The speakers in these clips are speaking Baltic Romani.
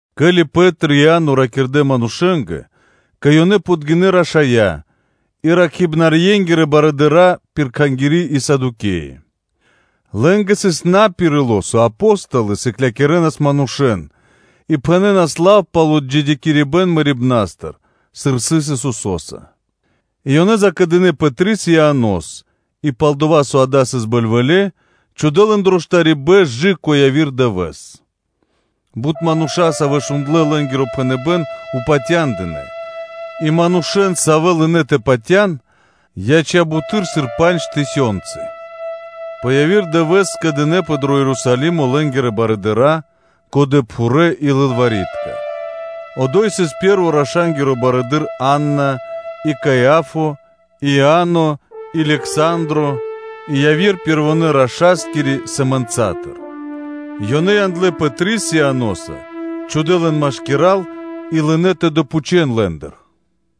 Ке́ли Пэ́три и Иа́но ракирдэ́ манушэ́нгэ, кэ ёнэ подгинэ́ рашая́ и ракхибнарьенгирэ барыдыра́ пир Кхангири́ и Садукеи, лэ́нгэ сыс пхаро́ пэ ило́, со Апо́столы сыклякирэнас манушэ́н, и пхэнэнас лав пал отджидякирибэн мэрибна́стыр, сыр сыс Исусо́са; и ёнэ закэдынэ Пэтрис и Ианос, и пал-дова́ со дава́ сыс бэльвэле́, ёнэ чхудэ́ лэн дро штарибэ́н кэ яви́р дывэ́с. Бут мануша́, савэ́ шундлэ́ лэ́нгиро пхэныбэ́н, упатя́ндынэ; и манушэ́н, савэ́ лынэ́ тэ патя́н, яця́ буты́р, сыр пандж тысёнцы. И пэ яви́р дывэ́с скэдынэ́пэ дро Ерусалимо лэ́нгирэ барыдыра́, годэпхурэ́ и лылвари́тка (кни́жники), одо́й сыс пэ́рво раша́нгиро барыдыро́ Анна, и Каиа́фа, и Иа́но, и Лександро (Александро) и яви́р пэрвонэ́-рашаскири сэмэнцатыр; ёнэ яндлэ́ Пэтрис Ианоса, чхудэ́ лэн машкира́л, и лынэ́ тэ допхучэн лэ́ндыр: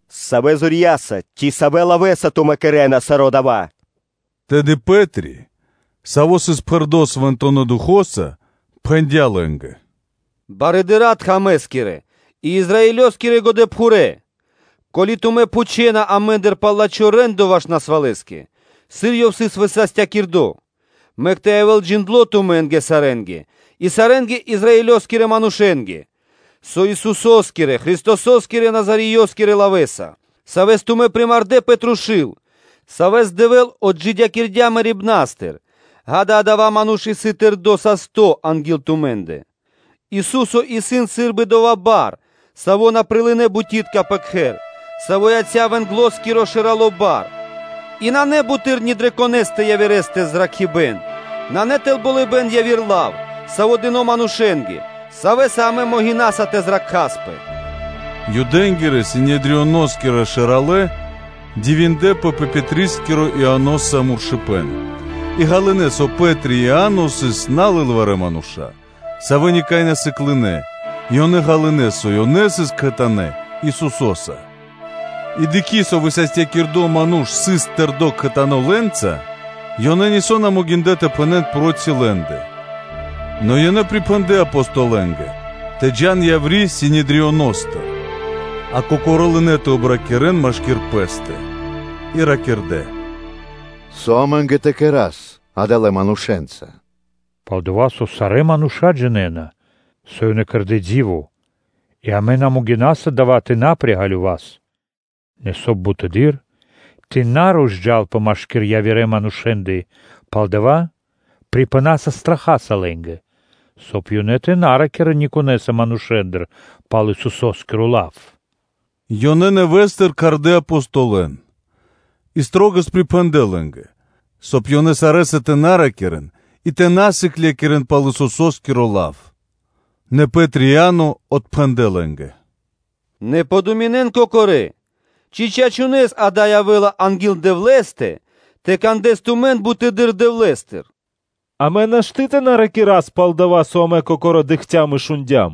“Савэ зорья́са ци савэ́ лавэ́са тумэ́ кэрэ́на саро́ дава́?” Тэды Пэ́три, саво́ сыс пхэрдо́ Свэнтонэ́ Духо́са, пхэндя́ лэ́нгэ: “Барыдыралэ тхэмэ́скирэ и Израилёскирэ годэпхурэ́! Ко́ли тумэ́ пхучэна амэ́ндыр пал лачхо́ рэ́ндо ваш насвалэскэ, сыр ёв сыс высастякирдо, мэк тэ явэ́л джиндло́ тумэ́нгэ сарэ́нгэ и сарэ́ Израилёскирэ манушэ́нгэ, со Исусо́скирэ-Христосо́скирэ лавэ́са, Саво́ сыс Назареё, и Савэс тумэ́ примардэ пэ трушу́л, Савэс Дэвэ́л отджидякирдя́ мэрибна́стыр, ґа́да, адава́ ману́ш исын тэрдо́ састо́ анги́л тумэ́ндэ. Ису́со исын сы́рбы ‘дова́ Бар, саво́ на прилынэ́ бутитка пэ кхэр, саво́ яця́ вэнглоскирэ шэралэ́ Барэса.’ И нанэ буты́р ни дрэ конэ́стэ явирэ́стэ зракхибэ́н, нанэ тэл болыбэ́н яви́р лав, саво́ дыно́ манушэ́нгэ, савэ́са амэ могинасас тэ зракхаспэ.” Юдэ́нгирэ-Синедрионоскирэ шэралэ́ дивиндлэ́пэ пэ Пэтрискиро Ианоса муршыпэн, и ґалынэ́, со Пэ́три и Иа́но сыс насыклэ мануша́, савэ́ никай на сыклынэ, и ёнэ ґалынэ́, со ёнэ сыс кхэтанэ́ Исусо́са. И дыкхи́, со высастякирдо ману́ш сыс тэрдо́ кхэтанэ́ лэ́нца, ёнэ нисо́ на могиндлэ́ тэ пхэнэ́н проти лэ́ндэ; нэ ёнэ припхэндлэ Апостолэнгэ тэ джа́н яври́ Синедрионостыр, а кокорэ́ лынэ́ тэ обракирэн машки́р пэ́стэ, и ракирдэ́: “Со амэ́нгэ тэ кэра́с адалэ́ манушэ́нца? Пал-дова́ со сарэ́ мануша́ джинэ́на, со ёнэ кэрдэ́ ди́во, и амэ на могинаса дава́ тэ на приґалёвас. Нэ соб (кай) бутэды́р тэ на розджалпэ машки́р явирэндэ манушэ́ндэ пал дава́, трашаваса лэн, соб (кай) ёнэ тэ на ракирэ́н никонэса манушэ́ндыр пал Исусо́скиро лав.” Ёнэ нэвэ́стыр кхардэ́ Апостолэн и шылалэс припхэндлэ лэ́нгэ, соб (кай) ёнэ сарэ́са тэ на ракирэ́н и тэ на сыклякирэ́н пал Исусо́скиро лав. Нэ Пэ́три и Иа́но отпхэндлэ́ лэ́нгэ: “Нэ дэн годы́ пэскэ́ (подуминэн) кокорэ́, ци чачунэ́с дава́ явэ́ла анги́л Дэвлэ́стэ, тэ кандэс тумэн бутэды́р Дэвлэ́стыр? Амэ́нгэ нашты́ тэ на ракирас пал дова́, со амэ кокорэ́ дыкхцям и шундя́м.”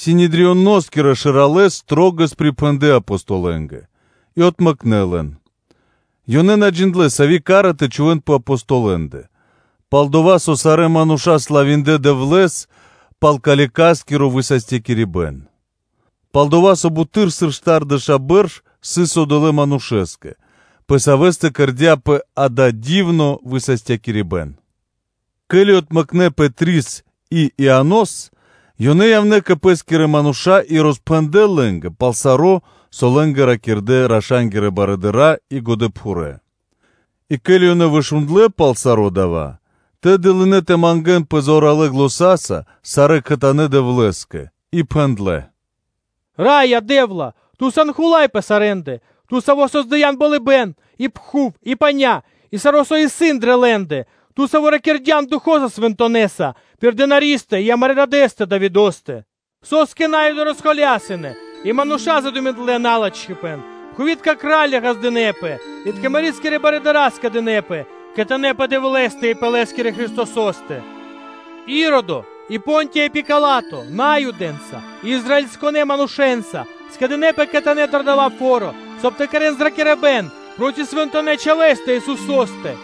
Синедрионоскирэ шэралэ́ шылалэс припхэндлэ Апостолэнгэ, и отмэкнэ лэн; ёнэ на джиндлэ́, сави́ ка́ра тэ чхувэ́н пэ Апостолэндэ, пал-дова́ со сарэ́ мануша́ славиндлэ Дэвлэ́с пал калекаскиро высастякирибэн; пал-дова́ со буты́р, сыр штардэша́ бэрш сыс одолэ́ манушэ́скэ, пэ савэ́стэ кэрдя́пэ дава́ дивно высастякирибэн. Ке́ли отмэкнэ Пэтрис и Ианос, ёнэ явнэ́ кэ пэ́скирэ мануша́ и роспхэндлэ́ лэ́нгэ пал саро́, со лэ́нгэ ракирдэ́ раша́нгирэ барыдыра́ и годэпхурэ́. И ке́ли ёнэ вышундлэ пал саро́ дава́, тэды лынэ́ тэ мангэ́нпэ зоралэ́ заня́са сарэ́ кхэтанэ́ Дэвлэ́скэ и пхэндлэ́: “Раё Дэ́вла! Ту сан Хула́й пэ сарэ́ндэ, Ту, Саво́ создыян болыбэ́н и пхув и паня́ и саро́, со исын дрэ лэ́ндэ: Ту, Саво́ ракирдян Духо́са Свэнтонэса пир Тырэ́ писхаристэ и амарэ́ дадэ́стэ Давидо́стэ: ‘Со́скэ На́юды дынэпэ шумоса тэ холясон и мануша́ задуминдлэ налачхипэн? Пхувитка кра́лья ґаздынэ́пэ и тхага́рья (кня́зи) скэдынэ́пэ кхэтанэ́ пэ Дэвлэ́стэ и пэ Лэ́скирэ Христосо́стэ.’ Иродо и Понтиё Пила́то Наюдэнца и Израилёскирэ манушэ́нца скэдынэ́пэ кхэтанэ́ дро дава́ фо́ро, соб (кай) тэ кэрэ́н зракирибэ́н проти Свэнтонэ́ Чхавэ́стэ Исусо́стэ.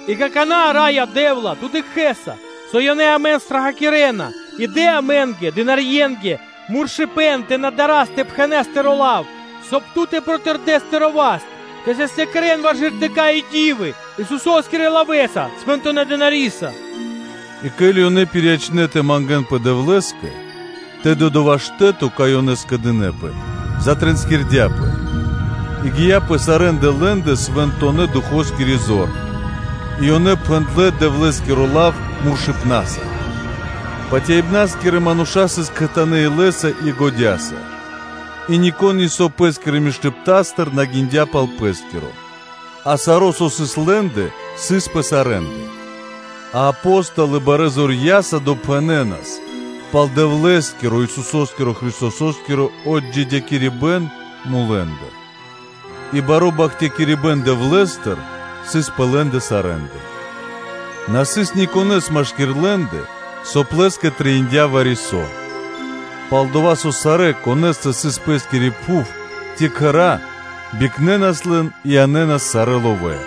И какана́, Раё Дэ́вла, Ту дыкхэ́са, со ёнэ амэн страхакирэна и дэ амэ́нгэ, писхарье́нгэ, муршыпэн тэ на дарас тэ пхэнас Тыро́ лав; соб (кай) Ту тэ протырдэс Тыро́ васт тэ састякирэн, ваш ґертыка́ и ди́вы Исусо́скирэ лавэ́са, Свэнтонэ́ Чхавэ́са.” И ке́ли ёнэ пириячнэ тэ мангэ́нпэ Дэвлэ́скэ, тэды дова́ штэ́то, кай ёнэ скэдынэ́пэ, затринскирдяпэ, и гия́ пэ сарэ́ндэ лэ́ндэ Свэнтонэ́-Духоскири зор и ёнэ пхэндлэ́ Дэвлэ́скиро лав муршыпнаса. Патяибнаскирэ мануша́ сыс кхэтанэ́ илэ́са и годя́са; и нико́н нисо́ пэ́скирэ миштыпна́стыр на гиндя пал пэ́скиро, а саро́, со лэ́ндэ сыс, сыс пэ сарэ́ндэ; а Апо́столы барэ́ зорья́са допхэнэнас пал Дэвлэ́скиро, Исусо́скирэ-Христосо́скиро отджидякирибэн мулэ́ндыр; и баро́ бахтякирибэ́н Дэвлэ́стыр сыс пэ лэ́ндэ сарэ́ндэ. На сыс никонэ́с машки́р лэ́ндэ; соб (кай) лэ́скэ трэиндя́ вари-со, пал-дова́ со сарэ́, конэ́стэ сыс пэс-кири пхув ци кхэра́, бикнэнас лэн и янэ́нас сарэ́ ловэ́,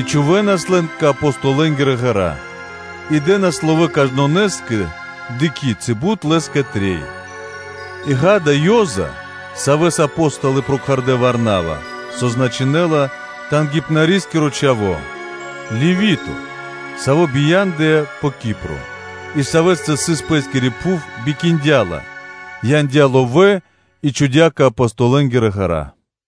и чхувэ́нас лэн кэ Апостолэнгирэ ґэра́; и дэ́нас ловэ́ кажнонэ́скэ, дыкхи́ ци бут лэ́скэ трэй. И, ґа́да, Ёза (Иосифо), савэ́с Апо́столы прокхардэ “Варнава”, со значынэ́ла: ‘Тангипнарискиро чхаво́’, Левито, саво́ бия́ндыя пэ Кипро, и савэ́стэ сыс пэ́скири пхув, бикиндя ла, яндя́ ловэ́ и чхудя́ кэ Апостолэнгирэ ґэра́.